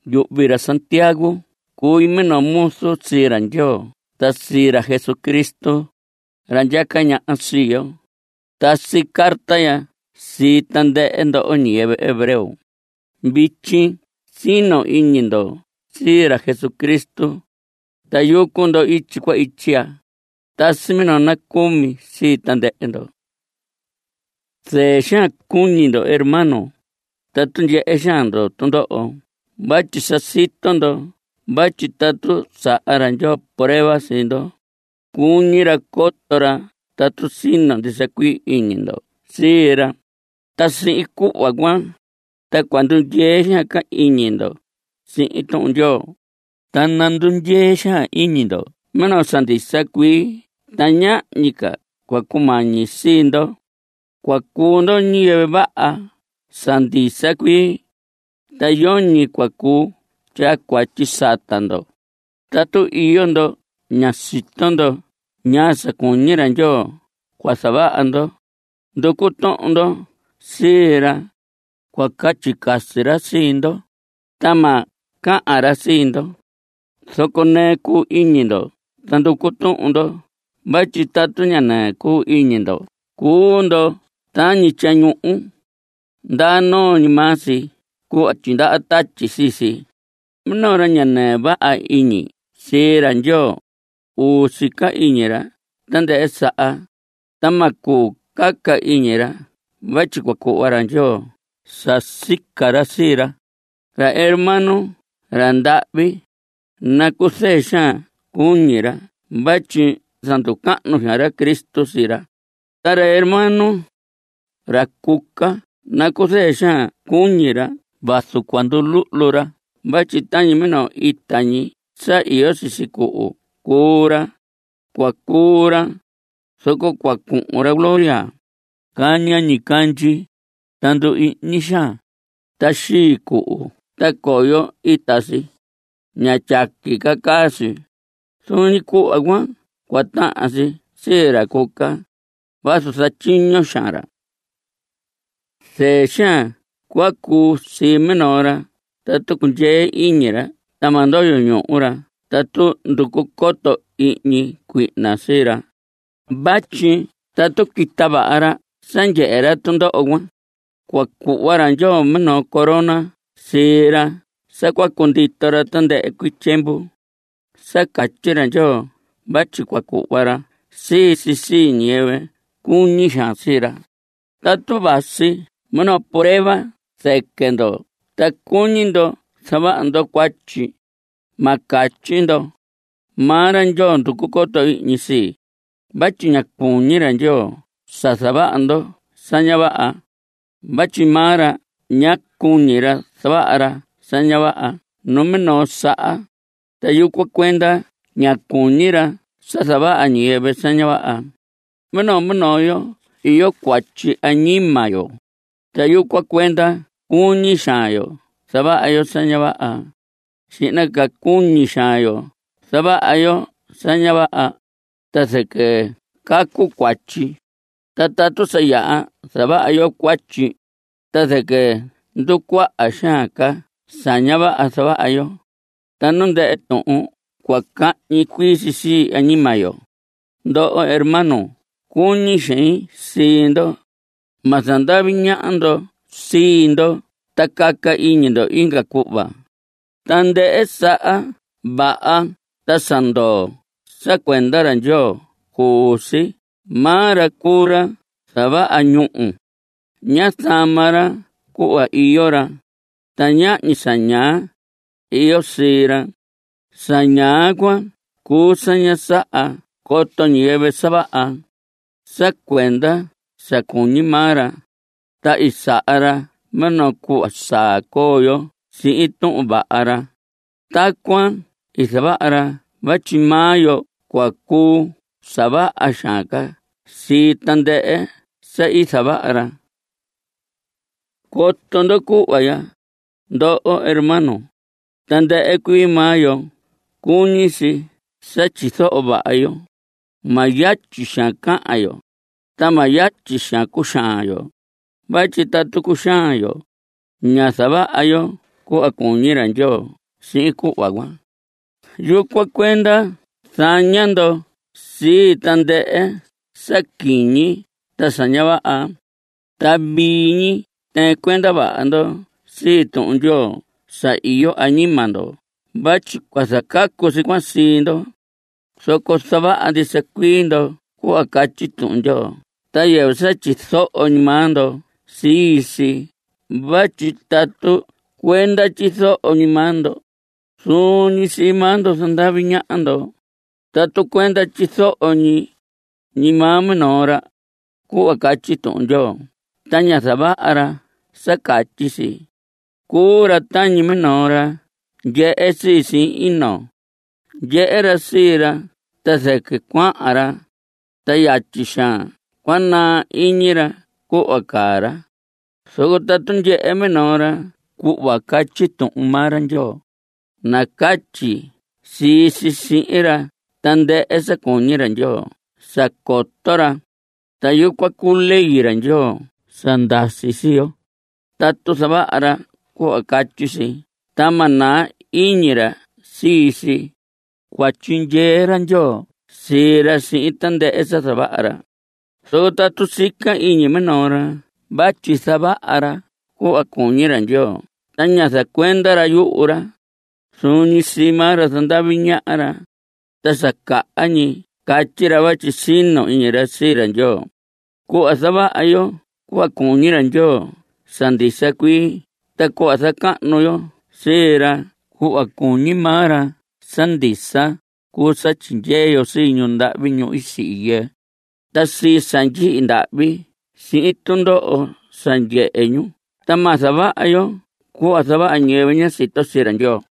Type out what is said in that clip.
Yuhvi ra Santiago cui minoo muzu sii ra Ndyoo ta sii ra Jesucristo, ra ndyaca ñaha sii yo. Tasi carta ya sii tandɨhɨ ndoho ñiyɨvɨ hebreo. Vityi sino iñi ndo sii ra Jesucristo, ta yucu ndo ityi cuan ityi ya. Tasi minoo nacumi sii tandɨhɨ ndo. Zɨɨ xaan cuñi ndo hermanos tatu ndyehe xaan ndo tundoho vatyi sa sito ndo vatyi tatu saha ra Ndyoo prueba sii ndo, cuñi ra coto ra tatu sino ndisa cuii iñi ndo sii ra. Ta sihin cuhva cuan, ta cua ndundyee xaan ca iñi ndo sihin Tuhun Ndyoo. Ta nandundyee xaan iñi ndo minoo sa ndisa cuii ta ñahñi ca cua cumañi sii ndo. Cua cuu ndo ñiyɨvɨ vaha sa ndisa cuii, ta yoñi cua cuu tyaa cuatyi sata ndo. Tatu iyo ndo ña sito ndo ñaa sa cuñi ra Ndyoo cua zavaha ndo, nducu tuhun ndo sii ra. Cua catyi casi ra sihin ndo, ta ma cahan ra sii ndo. Zoco nɨɨ cuu iñi ndo ta nducu tuhun ndo vatyi tatu ña nɨɨ cuu iñi ndo cuu ndo tañi tyañuhu. Ndaa noo ñi maa si cuhva tyindaha tatyi sii si. Minoo ra ña nɨɨ vaha iñi sii ra Ndyoo, uu sica iñi ra tandɨhɨ saha, ta ma cuu caca iñi ra vatyi cua cuhva ra Ndyoo sa sica ra sii ra. Ra hermano ra ndahvi, nacuzɨɨ xaan cuñi ra vatyi zanducahnu xaan ra Cristo sii ra. Ta ra hermano ra cuca, nacuzɨɨ xaan cuñi ra vazu cua nduluhlu ra vatyi tañi minoo ita ñi sa iyo sisi cuhu cuu ra. Cua cuu ra, zoco cua cuhun ra gloria. Caña ñicandyi, ta ndu‑ihñi xaan, ta xii cuhu ta coyo ita si. Ña tyaqui ca caa si. Zuun ñi cuhva cuan cua tahan si sii ra cuca, vazu zatyiño xaan ra. Zɨɨ xaan cua cuu sii minoo ra tatu cundyee iñi ra ta ma ndoyo ñuhu ra tatu nducu coto ihñi cuihna sii ra. Vatyi tatu quita vaha ra sa ndyehe ra tundoho cuan, cua cuhva ra Ndyoo minoo corona sii ra sa cua cundito ra tandɨhɨ cuii tyiemvu. Sa catyi ra Ndyoo vatyi cua cuhva ra sii si sii ñiyɨvɨ cuñi xaan sii ra. Tatu vasi minoo prueba zɨquɨ ndo ta cuñi ndo zavaha ndo cuatyi, ma catyi ndo: “Maa ra Ndyoo nducu coto ihñi sii.” Vatyi ña cuñi ra Ndyoo sa zavaha ndo sa ña vaha, vatyi maa ra ña cuñi ra zavaha ra sa ña vaha numinoo saha, ta yucuan cuenda ña cuñi ra sa zavaha ñiyɨvɨ sa ña vaha. Minoo minoo yo iyo cuatyi añima yo, ta yucuan cuenda cuñi xaan yo zavaha yo sa ña vaha. Xihna ca cuñi xaan yo zavaha yo sa ña vaha, ta zɨquɨ cacu cuatyi. Ta tatu sa yaha zavaha yo cuatyi, ta zɨquɨ nducuaha xaan ca sa ña vaha zavaha yo. Ta nu ndɨhɨ tuhun cua cahñi cuii si añima yo. Ndoho hermanos cuñi xein sii ndo. Ma zandavi ñaha ndo sii ndo ta caca iñi ndo inga cuhva. Tandɨhɨ sa vaha ta sa ndoo sa cuenda ra Ndyoo cuu si. Maa ra cuu ra i zavaha ñúhu. Ña zama ra cuhva iyo ra, ta ñahñi sa ñaa iyo sii ra. (Sa ñaa cuan cuu sa ña saha coto ñiyɨvɨ sa vaha.) Sa cuenda sa cuñi maa ra, ta i saha ra minoo cuhva saa coo yo sihin Tuhun Vaha ra. Tacuan i zavaha ra vatyi maa yo cua cuu sa vaha xaan ca sii tandɨhɨ sa i zavaha ra. Coto ndo cuhva ya, ndoho hermanos. Tandɨhɨ cuii maa yo cuñi si sa tyizoho vaha yo. Ma yatyi xaan cahan yo, ta ma yatyi xaan cuxaan yo. Vatyi tatu cuxaan yo, ña zavaha yo cuhva cuñi ra Ndyoo sihin cuhva cuan. Yucuan cuenda zaña ndo sii tandɨhɨ sa quiñi ta sa ña vaha, ta vii ñi tɨɨn cuenda vaha ndo sii Tuhun Ndyoo sa iyo añima ndo vatyi cua zacacu si cuan sii ndo. Zoco zavaha ndisa cuii ndo cuhva catyi Tuhun Ndyoo ta yɨvɨ sa tyizoho ñi maa ndo sii si vatyi tatu cuenda tyizoho ñi maa ndo, zuun ñi sii maa ndo zandavi ñaha ndo. Tatu cuenda tyizoho ñi maa minoo ra cuhva catyi Tuhun Ndyoo ta ña zavaha ra sa catyi si, cuu ra tañi minoo ra ndyehe sii sihin ino. Ndyehe ra sii ra ta zɨquɨ cuahan ra, ta yatyi xaan naa iñi ra cuhva caa ra. Zoco tatu ndyehe minoo ra cuhva catyi Tuhun maa ra Ndyoo, nacatyi si sihin ra tandɨhɨ sa cuñi ra Ndyoo sa coto ra, ta yucuan cuu ley ra Ndyoo sa ndasi sii yo. Tatu zavaha ra cuhva catyi si ta ma naa ñi iñi ra sii si, cua tyindyee ra Ndyoo sii ra sihin tandɨhɨ sa zavaha ra. Zoco tatu sica iñi minoo ra vatyi zavaha ra cuhva cuñi ra Ndyoo ta ña zacuenda ra yuhu ra, zuun ñi sii maa ra zandavi ñaha ra, ta sa caha ñi catyi ra vatyi sino iñi ra sii ra Ndyoo. Cuhva zavaha yo cuhva cuñi ra Ndyoo sa ndisa cuii ta cuhva zacahnu yo sii ra cuhva cuñi maa ra sa ndisa, cuu sa tyindyee yo sii ñu ndahvi, ñu i sihi yɨɨ, ta sii sa ndyihi ndahvi sihin tundoho sa ndyehe ñu ta ma zavaha yo cuhva zavaha ñiyɨvɨ ña sito sii ra Ndyoo.